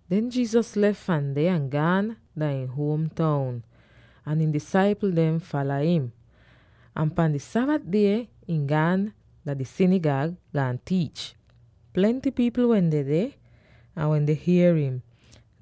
Den Jesus lef fahn deh, ahn gaan dah ihn huom toun, ahn ihn disaipl dem fala im. Ahn pan di Sabat die, ihn gaan dah di sinigag, gaan tiich. Plenty pipl wehn dedeh, ahn wen dehn hier im,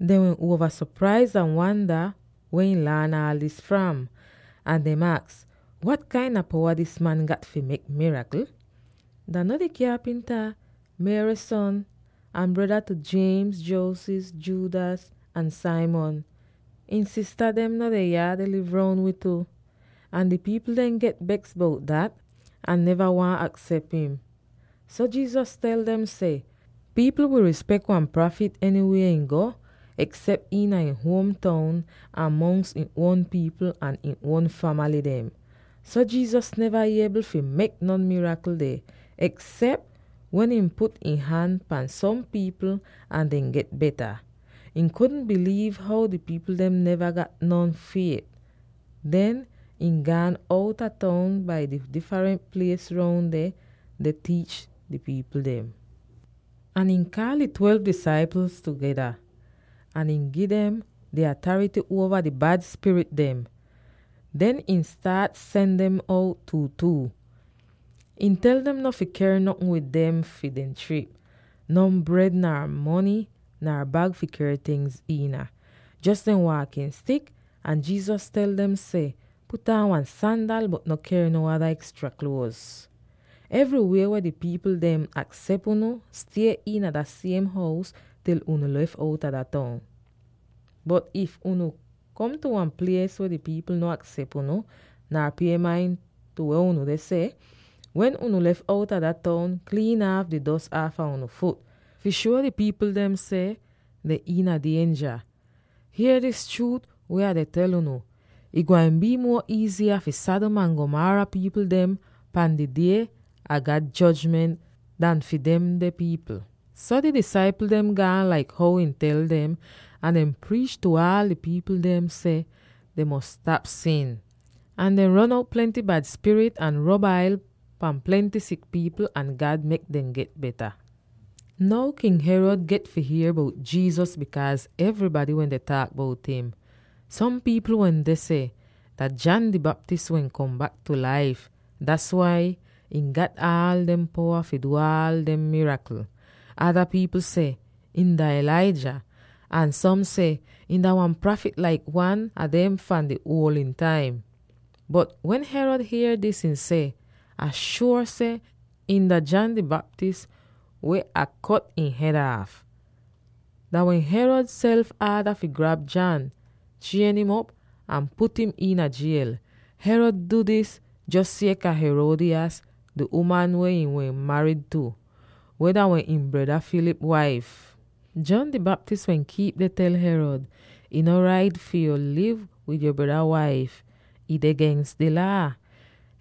dehn wehn uova sopraiz ahn wanda weh ihn laan aal dis fram. Ahn dem aks, “Wat kain a powa dis man gat fi mek mirakl. Dah no di kyapimta, Mary son, ahn breda tu: James, Joses, Judas, ahn Simon? Ihn sista dem no deh yah deh liv roun wi tu?” Ahn di pipl dem get beks bout dat ahn neva waahn aksep im. So Jesus tel dem seh, “Pipl wi rispek wan prafit enywie ihn go, eksep iina ihn huom toun, ahn mongs ihn uon pipl ahn ihn uon famaly dem.” So Jesus neva iebl fi mek non mirakl deh, eksep wen ihn put ihn han pan som pipl ahn dehn get beta. Ihn kudn biliiv how di pipl dem neva gat non fiet. Den ihn gaan outa toun bai di difrent plies roun deh, deh tiich di pipl dem. Ahn ihn kaal di twelve disaipl tugeda, ahn ihn gi dem di atarity uova di bad spirit dem. Den ihn staat sen dem out two-two. Ihn tel dem no fi ker notn wid dem fi dehn trip: non bred, nar mony, nar bag fi ker tingz iina; jos dehn waakin stik. Ahn Jesus tel dem seh, “Put aan wan sandal, bot no ker no ada ekstra kluoz. Enywie weh di pipl dem aksep unu, stie iina dat siem hous til unu lef outa dah toun. Bot if unu kom tu wan plies weh di pipl no aksep unu, nar pie main tu weh unu deh seh, wen unu lef outa dah toun, kliin aaf di dos aafa unu fut, fi shuo di pipl dem seh dehn iina dienja. [Hier dis chruut weh Ah deh tel unu: ih gwain bii muo iiziya fi Sodom ahn Gomorrah pipl dem di die a God jojment an fi demde pipl.]” So di disaipl dem gaan laik how ihn tel dem, ahn dehn priich tu aal di pipl dem seh dehn fi stap sin. Ahn dehn ron out plenty bad spirit ahn rob ail pan plenty sik pipl ahn God mek dem get beta. Now King Herod get fi hier bout Jesus bikaaz evrybady wende taak bout im. Som pipl wende seh, “Dah John di Baptist weh kom bak tu laif; das wai ihn gat aal demde powa fi du aal demde mirakl.” Ada pipl seh, “Ihn dah Elijah.” Ahn som seh, “Ihn dah wan prafit laik wan a dem fahn di uoldn taim.” Bot wen Herod hier dis, ihn seh, “Ah shuor seh ihn dah John di Baptist weh Ah kut ihn hed aaf.” Dah wehn Herod self aada fi grab John, chien'im op, ahn put im iina jiel. Herod du dis jos sieka Herodias, di uman weh ihn wehn marid tu, weh dah wehn ihn breda Philip waif. John di Baptist wehn kiip deh tel Herod, “Ih no rait fi yu liv wid yo breda waif; ih deh gens di Laa!”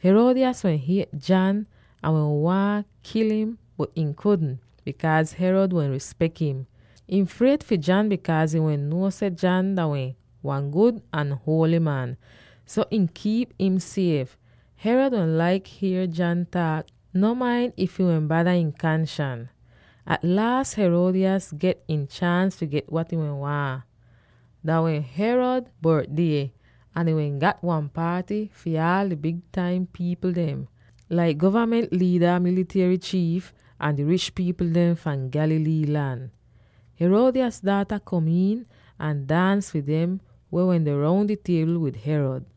Herodias wehn hiet John ahn wehn waahn kil im, bot ihn kudn, bikaaz Herod wehn rispek im. Ihn fried fi John, bikaaz ihn wehn nuo seh John dah wehn wan gud ahn huoly man. So ihn kiip im sief. Herod wehn laik hier John taak, no main if ih bada ihn kanshans. At laas Herodias get ihn chaans fi get wat ihn wehn waahn. Dah wehn Herod bortdie, ahn ihn wehn gat wan paaty fi aal di big taim pipl dem, laik govament liida, militiery chiif, ahn di rich pipl dem fahn Galilee lan. Herodias daata kom iin ahn daans fi dem weh wende roun di tiebl wid Herod,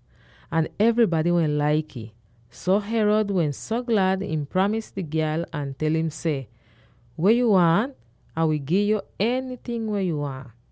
ahn evrybady wehn laik ih. So, Herod wehn so glad ihn pramis di gyal ahn tel im seh, “Weh yu waahn? Ah wi gi'yo enyting weh yu waahn.”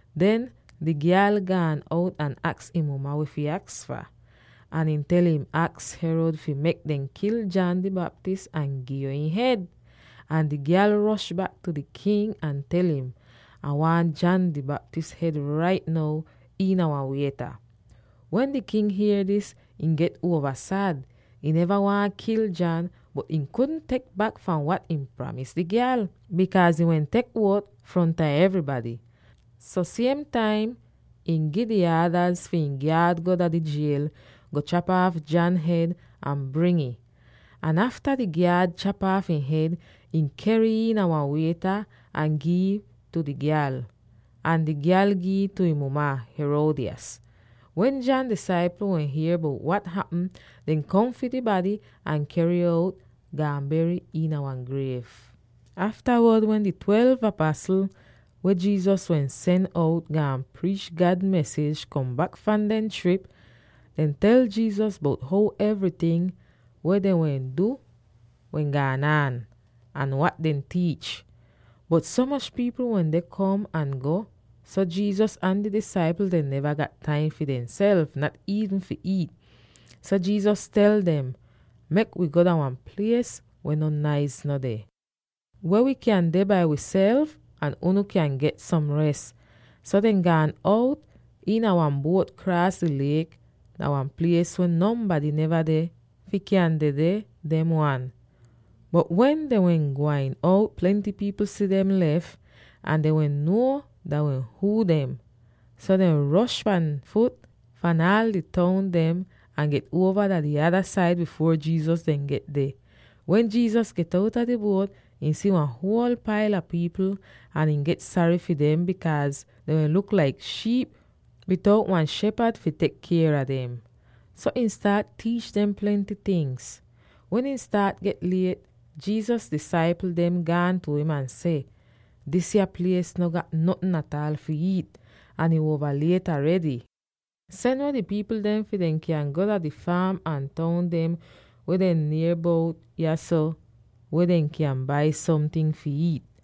Den, di gyal gaan out ahn aks ihn muma weh fi aks fah. Ahn ihn tel im, “Aks Herod fi mek dem kil John di Baptist ahn gi'yo ihn hed.” Ahn di gyal rosh bak tu di king ahn tel im, “Ah waahn John di Baptist hed rait now iina wan wieta.” Wen di king hier dis, ihn get uova sad. Ihn neva waahn kil John, bot ihn kudn tek bak fahn wat ihn pramis di gyal, bikaaz ihn wehn tek uot fronta evrybady. So siem taim ihn gi di aadaz fi ihn gyaad go dah di jiel, go chap aaf John hed ahn bring ih. Ahn afta di gyaad chap aaf ihn hed, ihn ker'ih iina wan wieta, ahn gi'ih tu di gyal, ahn di gyal gi'ih tu ihn muma, Herodias. Wen John disaipl dehn hier bout wat hapm, dehn kom fi di bady ahn ker'ih out, gaan ber im iina wan griev. Aftawod, wen di twelve apasl, weh Jesus wehn sen out gaan priich God mesij, kom bak fahn dehn trip, dehn tel Jesus bout how evryting weh dehn wehn du wehn gaan aan, ahn wat dehn tiich. Bot so moch pipl wehn deh kom ahn go, so Jesus ahn di disaipl dem neva gat taim fi demself, nat iivn fi iit. So Jesus tel dem, “Mek wi go dah wan plies weh non naiz no deh, weh wi kyan deh bai wiself, ahn unu kyan get som res.” So dehn gaan out iina wan buot kraas di liek dah wan plies weh nonbady neva deh fi kyan dedeh dem wan. Bot wen dehn wehn gwain out, plenty pipl si dem lef, ahn dehn wehn nuo dah wehn huu dem. So dehn rosh pan fut fahn aal di toun dem, ahn get uova dah di ada said bifuor Jesus dem get deh. Wen Jesus get outa di buot, ihn si wan huol paila pipl ahn ihn get sary fi dem, bikaaz dehn wehn luk laik shiip bitout wan shepad fi tek kier a dem. So ihn staat tiich dem plenty tingz. Wen ih staat get liet, Jesus disaipl dem gaan tu im ahn seh, “Disya plies no gat notn ataal fi iit, ahn ih uova liet aredy. Sen weh di pipl dem fi dehn kyan go dah di faam ahn toun dem weh deh nier bout yahso weh dehn kyan bai somting fi iit.”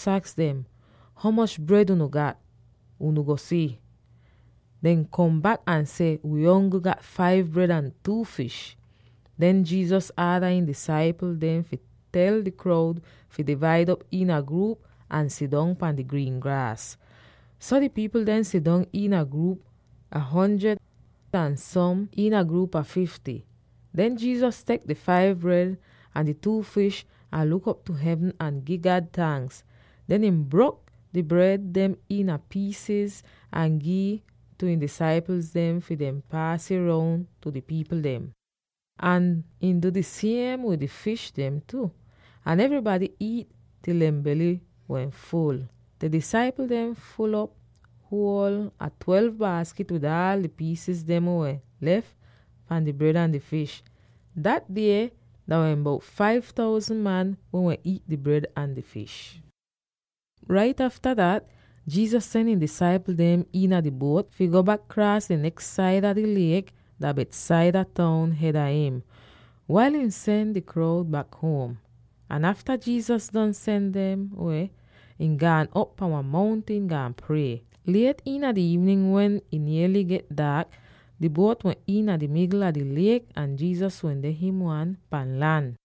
Jesus aks dem, “Ho moch bred unu gat? Unu go si.” Dehn kom bak ahn seh, “Wi ongl gat five bred ahn two fish.” Den Jesus aada ihn disaipl dem fi tel di kroud fi divaid op iina gruup ahn sidong pahn di griin graas. So di pipl dem sidong iina gruup a hundred ahn som iina gruup a fifty. Den Jesus tek di five bred ahn di two fish ahn luk op tu hevn ahn gi God tanks. Den ihn brok di bred dem iina piisiz ahn gi'ih tu ihn disaipl dem fi dehn paas ih roun tu di pipl dem. Ahn ihn du di siem wid di fish dem tu. Ahn evrybady iit til dehn bely wehn ful. Den di disaipl dem ful'op huol a twelve baaskit wid aal di piis dem weh wehn lef fahn di bred ahn di fish. Dat die dah wehn bout five thousand man weh wehn iit di bred ahn di fish! Rait afta dat Jesus sen ihn disaipl dem iina di buot fi go bak kraas di neks saida di liek dah Bethsaida toun hed a im, wail ihn sen di kroud bak huom. Ahn afta Jesus don sen dem weh, ihn gaan op pahn wan mountin, gaan prie. Liet iina di iivnin wen ih niely get daak, di buot wehn iina di migl a di liek ahn Jesus wende him wan pahn lan.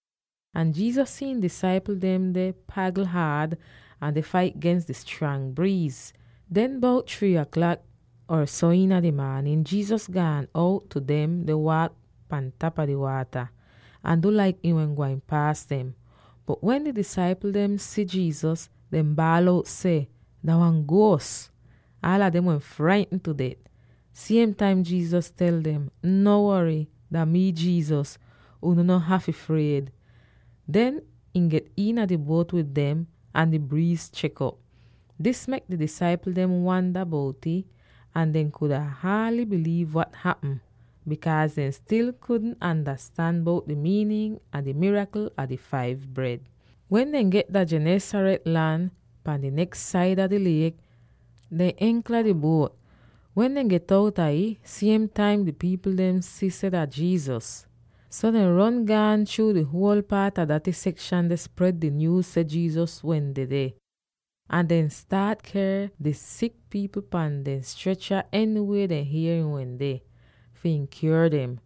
Ahn Jesus si ihn disaipl dem deh pagl haad ahn deh fait gens di strang briiz. Den, bout three aklak or so iina di maanin, Jesus gaan out tu dem deh waak pahn tapa di waata, ahn du laik ihn wehn gwain paas dem. Bot wen di disaipl dem si Jesus, dehn baal out seh, “Dah wan guos!” Aala dem wehn fraitn tu det. Siem taim Jesus tel dem, “No wory! Dah mii, Jesus; unu no hafy fried!” Den ihn get iina di buot wid dem, ahn di briiz chek'op! Dis mek di disaipl dem wanda bout'ih, ahn dehn kuda haaly biliiv wat hapm, bikaaz dehn stil kudn andastan bout di miinin a di mirakl a di five bred. Wen dehn get dah Gennesaret lan pahn di neks saida di liek, dehn enka di buot. Wen dehn get outa ih, siem taim di pipl dehn si seh dah Jesus. So dehn ron gaan chruu di huol paat a daty sekshan deh spred di nyuuz seh Jesus wehn dedeh. Ahn dehn staat ker dehn sik pipl pahn dehn strecha enywie dehn hier ihn wehn deh, fi ihn kyuor dem.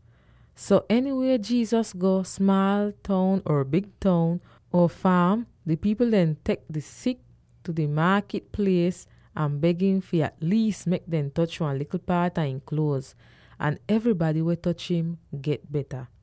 So, enywie Jesus go, smaal toun or big toun, or faam, di pipl dem tek dehn sik tu di maakit plies ahn beg im fi at liis mek dem toch wan likl paat a ihn kluoz. Ahn evrybady weh toch im, get beta.